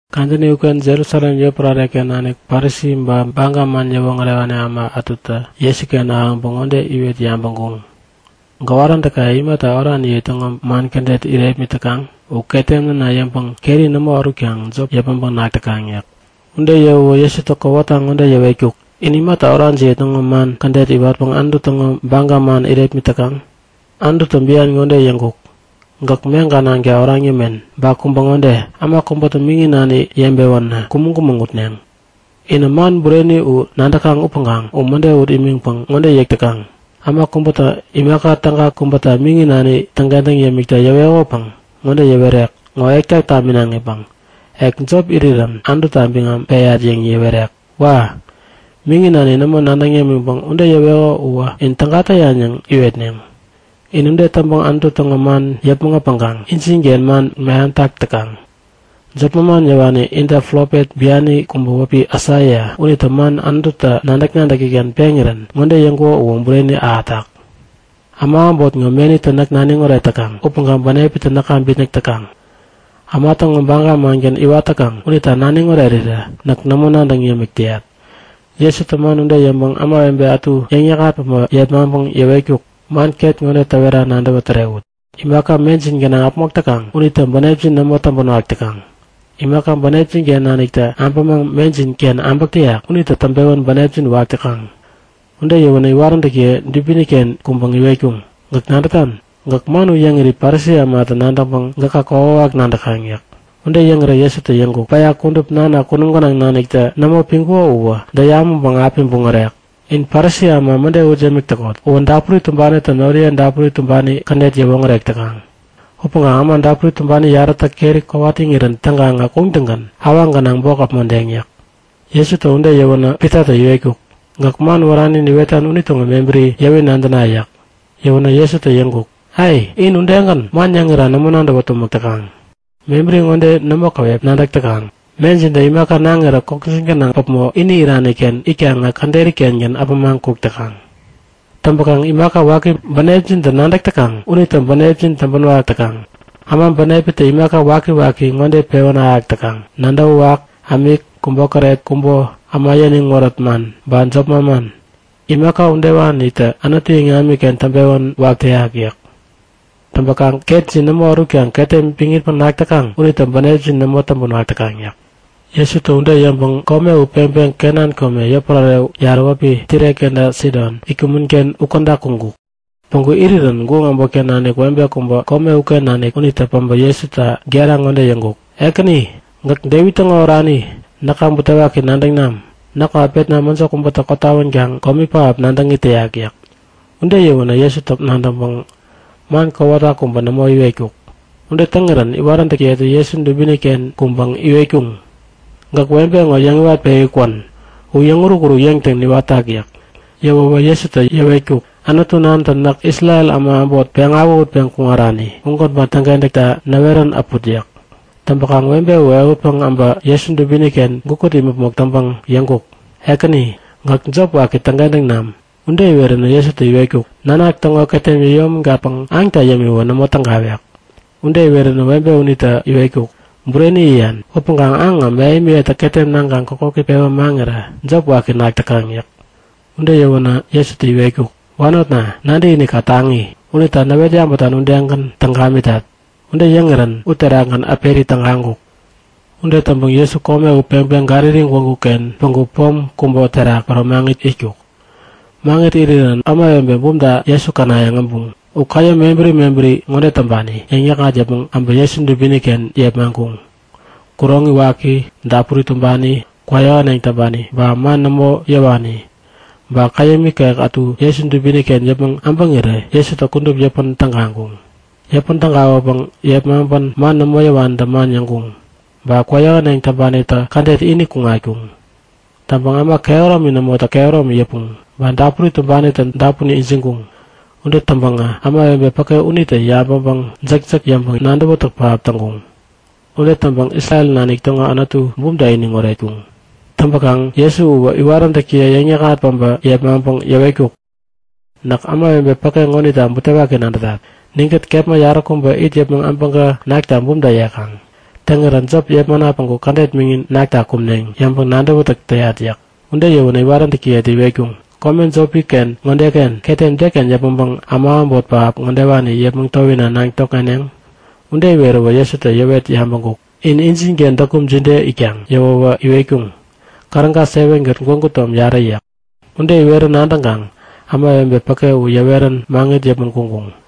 Kadäni uken Jerusalem yotpärare-ken nanik Parisi ba Baga man yäwoŋärewani äma ätutä Jesuken ahäŋpäŋ ŋode iwet yabäŋkuŋ; Gäwaräntäkaye imata oraniye täŋo man kädet irepmit täkaŋ? U ketem näna yäŋpäŋ keri nämo ärutkaŋ jop yäpmäŋpäŋ nak täkaŋ yäk. Ude yäwäwä Jesutä kowata ŋode yäwetkuk; In imata orajiye täŋo man kädet iwatpäŋ Anutu täŋo baga man irepmit täkaŋ? Anututä bian ŋode yäŋkuk; Gäk meŋka nanka oraŋ yämen. Ba kubä ŋode; Äma kubätä miŋi nani yebewänä kumäŋ-kumäŋ utneŋ. Inä man bureni u nadäkaŋ upäŋkaŋ u mäde ut imiŋpäŋ ŋode yäk täkaŋ; Äma kubätä imaka täga kubäta miŋi nani täŋkentäŋ yämikta yäwekopäŋ ŋode yäwerek; Ŋo ekta taminaŋipäŋ ek jop irirän Anututa biŋam peyat yäŋ yäwerek. Wa! Miŋi nani nämo nadäŋ yämiŋpäŋ ude yäweko uwä in täga täyan yäŋ iwetneŋ. In ude täŋpäŋ Anutu täŋo man yäpmäŋ äpäŋkaŋ injinken man meham täk täkaŋ. Jop manman yäwani inta profet biani kubä wäpi Aisaia unitä man Anututä nadäk-nadäki-ken peŋirän ŋode yäŋkuko uwä bureni ahätak; Äma äbot ŋo menitä näk naniŋ oret täkaŋ upäŋkaŋ bänepitä näka bitnäk täkaŋ. Äma täŋo baga mangän iwat täkaŋ unita naniŋ orerirä näk nämo nadäŋ yämik täyat. Jesutä man ude yäŋpäŋ ämawebe ätu yäŋ yäŋ-yäkŋat päbä yepmaŋpäŋ yäwetkuk; Man ket ŋode täwera nadäwä tärewut; Imaka mejin gänaŋ äpmok täkaŋ unitä bänepjin nämo täŋpänwak täkaŋ. Imaka bänepjin-ken naniktä äbämaŋ mejin-ken äbäk täyak unitä täŋpewän bänepjin wak täkaŋ. Ude yäwänä iwaräntäkiyetä dubini-ken kuŋpäŋ iwetkuŋ; Gäk nadätan? Gäk man u yäŋiri Parisi ämatä nadäŋpäŋ gäka kokwawak nadäkaŋ yäk. Ude yäŋirä Jesutä yäŋkuk; Päya kudup Nana kunum gänaŋ naniktä nämo piŋkuko uwä däyamäŋpäŋ api buŋärek. In Parisi äma mäde ut yämik täkot. Uwä dapuri tumbanitä noriye dapuri tumbani kädet yäwoŋärek täkaŋ. Upäŋkaŋ äma dapuri tumbani yarätä keri kowat iŋirän täŋkaŋä kuŋtäŋgän awaŋ gänaŋ bok äpmodeŋ yäk. Jesutä ude yäwänä Pitatä iwetkuk; Gäk man wärani niwetan unitäŋo mebäri yäwi nadäna yäk. Yäwänä Jesutä yäŋkuk; Ai! In udegän, man yäŋira nämo nadäwä tumäk täkaŋ. Mebäri ŋode nämo käwep nadäk täkaŋ; Mejintä imaka naŋirä kokjin gänaŋ päpmo ini irani-ken itkaŋä käderi-kengän äpämaŋ kuk täkaŋ. Täŋpäkaŋ imaka waki bänepjintä nadäk täkaŋ unitä bänepjin täŋpänwak täkaŋ. Äma bänepitä imaka wakiwaki ŋode pewän ahäk täkaŋ; Nadäwäwak, ämik, kubokäret, kubo, äma yäniŋ wärät man, ba jop manman. Imaka udewanitä Anutu iŋamiken täŋpewän wak täyak yäk. Täŋpäkaŋ ketjin nämo ärutkaŋ ketem piŋitpäŋ nak täkaŋ unitä bänepjin nämo täŋpänwak täkaŋ yäk. Jesutä ude yäŋpäŋ kome u peŋpeŋ Kenan kome, yotpärare yarä wäpi Tire kenta Sidon itkumän-ken ukäda kuŋkuk. Päŋku irirän guŋ äbotken nanik webe kubä, kome uken nanik unitä päbä Jesuta gera ŋode yäŋkuk; Ekäni! Gäk Devit täŋo oranitä näka butewaki nadäŋ nam! Näkŋo äpetnawä mäjo kubätä kotawänkaŋ komi pähap nadäŋ it täyak yäk. Ude yäwänä Jesutä nadäŋpäŋ man kowata kubä nämo iwetkuk. Ude täŋirän iwaräntäkiyetä Jesu dubini-ken kuŋpäŋ iwetkuŋ; Gäk webe ŋo yäŋ iwatpewi kwän! U yäŋ-urukuruk yäŋtäŋ niwatak yäk. Yäwäwä Jesutä yäwetkuk; Anutu Nantä näk Isrel äma äbot, peŋ awähutpeŋ kuŋarani, ugänpäŋ täŋkentäkta näwerän äput yäk. Täŋpäkaŋ webe u ehutpäŋ äbä Jesu dubini-ken gukut imäpmok täŋpäŋ yäŋkuk; Ekäni, gäk jop waki täŋkentäŋ nam! Ude iweränä Jesutä iwetkuk; Nanak täŋo ketem yäyomägatpäŋ aŋta yämiwä nämo tägawek. Ude iweränä webe unitä iwetkuk; Bureni yäyan upäŋkaŋ aŋä mähemiyetä ketem naŋkaŋ kokoki pewä maŋirä jop waki nak täkaŋ yäk. Ude yäwänä Jesutä iwetkuk; Wanotna, nadäkinikka taŋi! Unita näwet yabätan udegän täŋ gamitat. Ude yäŋirän uterakgän äperi tägaŋkuk. Ude täŋpäŋ Jesu kome u peŋpeŋ Galili gwägu-ken päŋku pom kubä terak päro maŋit itkuk. Maŋit irirän ämawebe bumta Jesu känayäŋ äbuŋ. U käyäm mebäri mebäri ŋode täŋpani yäŋ-yäkŋat yäpmäŋ äbä Jesu dubini-ken yepmaŋkuŋ; Kuroŋi waki, dapuri tumbani, kwäyähäneŋ täŋpani ba man nämo yäwani ba käyäm ikek ätu Jesu dubini-ken yäpmäŋ äbäŋirä Jesutä kudup yäpän tägaŋkuŋ. Yäpän tägawäpäŋ yepmaŋpän man nämo yäwanitä man yäŋkuŋ. Ba kwäyähäneŋ täŋpanitä kädet ini kuŋatkuŋ. Täŋpäŋ äma kehäromini nämotä kehäromi yäpuŋ. Ba dapuri tumbanitä dapun ijiŋkuŋ. Ude täŋpäkaŋä ämawebe päke unitä yabäŋpäŋ jäkjäk yäŋpäŋ nadäwätäk pähap täŋkuŋ. Ude täŋpäŋ Isrel nanik täŋo Anutu bumta iniŋ oretkuŋ. Täŋpäkaŋ Jesu uwä iwaräntäkiye yäŋ-yäkŋat päbä yepmaŋpäŋ yäwetkuk; Näk ämawebe päke ŋonita butewaki nadätat. Ninkät kepma yaräkubä it yäpmäŋ abäŋkä nakta bumta yekaŋ. Täŋirä jop yepmana päŋku kädet miŋin nakta kumneŋ yäŋpäŋ nadäwätäk täyat yäk. Ude yäwänä iwaräntäkiyetä iwetkuŋ; Kome jopi-ken ŋodeken ketem deken yäpmäŋpäŋ äma äbot pähap ŋodewani yepmäŋ towina naŋ tokŋeneŋ? Ude iweräwä Jesutä yäwet yabäŋkuk; Injinken däkum jide itkaŋ? Yäwänä iwetkuŋ; Käräga 7kät gwägu tom yarä yäk. Ude iwerä nadäŋkaŋ ämawebe päke u yäwet-pewän maŋit yäpmäŋ kuŋkuŋ.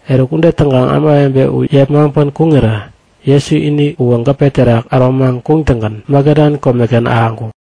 Eruk ude täŋkaŋ ämawebe u yepmaŋpän kuŋirä Jesu ini uwä gäpe terak äromaŋ kuŋtäŋgän Magadan komeken ahäŋkuk.